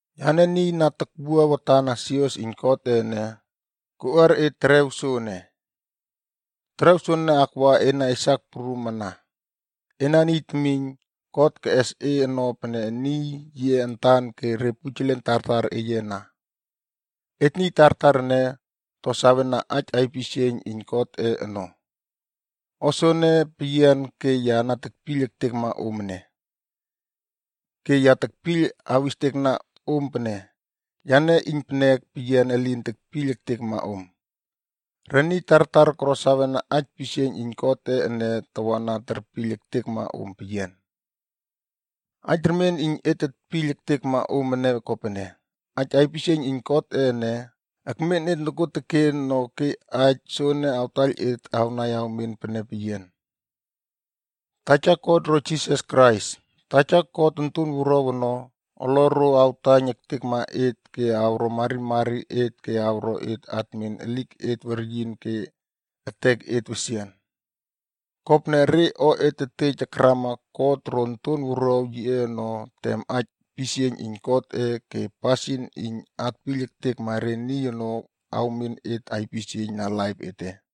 Yane niy na takwua watan na sios iyn Godꞌe ene, koꞌuar e terew soene. Terew soene akwa ena esak prum ana. Ena niy temiyna God keꞌes e ono pene niy yiꞌe antan ke re pujelen tartar eye ana. Et niy tartar ene, to sawena aij aipisieiyn iyn Godꞌe ono. O soene peyian ke ya na tekpiyl ektekma om ene. Ke ya tekpiyl awistekna om pene, yane iynpenek peyian elin tekpiyl ektekma om. Re niy tartar koro sawena aij pisieiyn iyn Godꞌe ene tawana terpiyl ektekma om peyian. Aij remien iyn et tetpiyl ektekma om ene kopene, aij aipisieiyn iyn Godꞌe ene, ekmen et nokuoteken no ke aij soene awtaiyl et awnai awmen pene peyian. Taja God ro Jisas Krais, Taja God Onton Wuruaw ono, oloro awtaiyn ektekma et ke awro marimari et ke awro et atmen eliket weryin ke eteket wesian. Kopene, re o et tetej akrama God ro Onton Wuruaw yiꞌe ono tem aij pisieiyn iyn Godꞌe ke pasin iyn atpiyl ektekma re niy ono awmen et aipisieiyn na laip ete.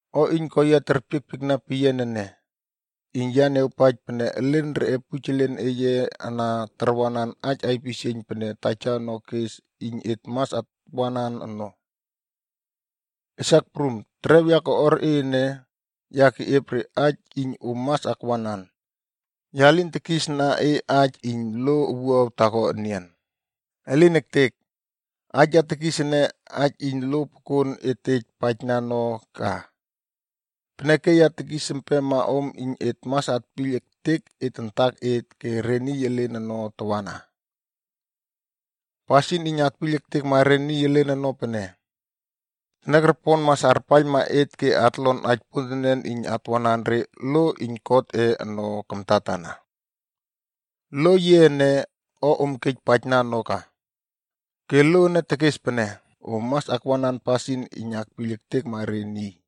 O iyn ko yia terpiekpiekna peyian ene, iyn ya niawpaij pene elen reꞌe pujelen eye ana tarwanan aij aipisieiyn pene Taja ono kes iyn et mas atwanan ono. Esak prum, terew ya tokꞌuar e ene, ya keꞌiep re aij iyn om mas akwanan. Ya lin tekisna e aij iyn lo owuaw taako enian. Elin ektek! Aij ya tekis ene, aij iyn lo pokon et tej paijna ono ka. Peneke ya tekis empema om iyn et mas atpiyl ektek et antaket ke re niy elen ono tawana. Pasin iyn atpiyl ektekma re niy elen ono pene, teniakropon mas arpaiylma et ke atlon aij pontenen iyn atwanan re lo iyn Godꞌe ono kamtatana. Lo yiꞌe ene, o om kej paijna no ka. Ke lo ene tekes pene: Om mas akwanan pasin iyn akpiyl ektekma re niy.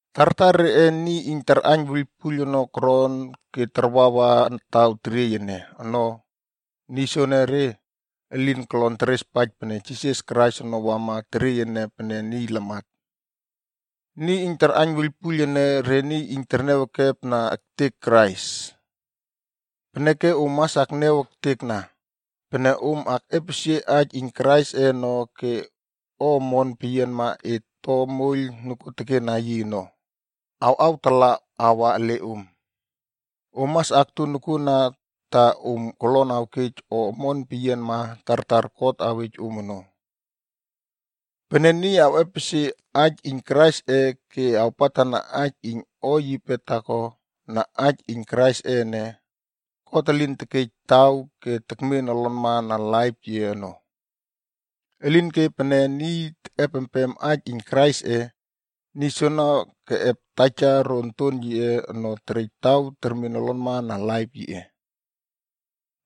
Tartar reꞌe niy iyn tarꞌaiyn wuiylpuiyl ono koron ke tarwawa taw teriey ene ono. Niy soenere, elin kolon terespaij pene Jisas Krais ono wama teriey ene pene niy lamat. Niy iyn tarꞌaiyn wuiylpuiyl ene, re niy iyn terniaw ekepna ektek Krais. Peneke om mas akniaw ektekna. Pene om akꞌepesie aij iyn Kraisꞌe ono ke o omon peyianma et to moiyl nokuotekena yi ono, awꞌawtala awa ele om. Om mas akto nokuoteken ta om kolon awkej o omon peyianma tartar God awej om ono. Pene niy awꞌepesie aij iyn Kraisꞌe ke awpatna aij iyn o yipe taako na aij iyn Kraisꞌe ene, God elin tekej taw ke tekmen olonma na laip yiꞌe ono. Elinke pene niy tekꞌepempem aij iyn Kraisꞌe, niy soono keꞌep Taja ro Onton yiꞌe ono terej taw termen olonma na laip yiꞌe.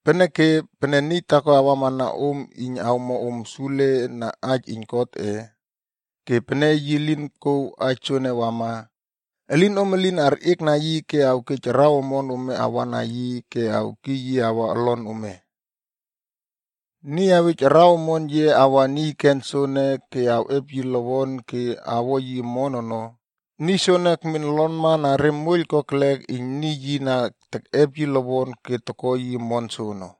Peneke, pene niy taako awamana om iyn awmo om sule na aij iyn Godꞌe, ke pene yi lin kouw aij soene wama, elinom elin arꞌiekna yi ke awkej araw omon ome awana yi ke awkiy yi awa olon ome. Niy awej araw omon yiꞌe awa niy ken soene ke awꞌep yi lowon ke awo yi omon ono, niy soene ekmen olonma na re moiyl kokelek iyn niy yi na tekꞌep yi lowon ke toko yi omon soono.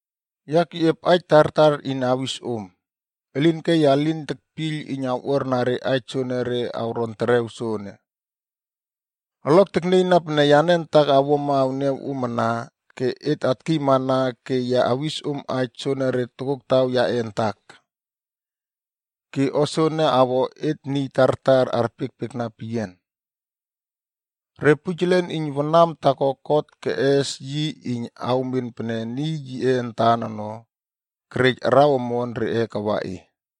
Ya keꞌiep aij tartar iyn awis om. Elinke ya lin tekpiyl iyn awꞌuarna re aij soenere awron terew soene. Olok teknieyna pene yane antak awuama awniaw om ana ke et atkiymana ke ya awis om aij soenere tokoktaw yaꞌe antak. Ke o soene awo et niy tartar arpiekpiekna peyian. Re pujelen iyn wanam taako God keꞌes yi iyn awmen pene niy yiꞌe antan ono, kerej araw omon reꞌe kawa e.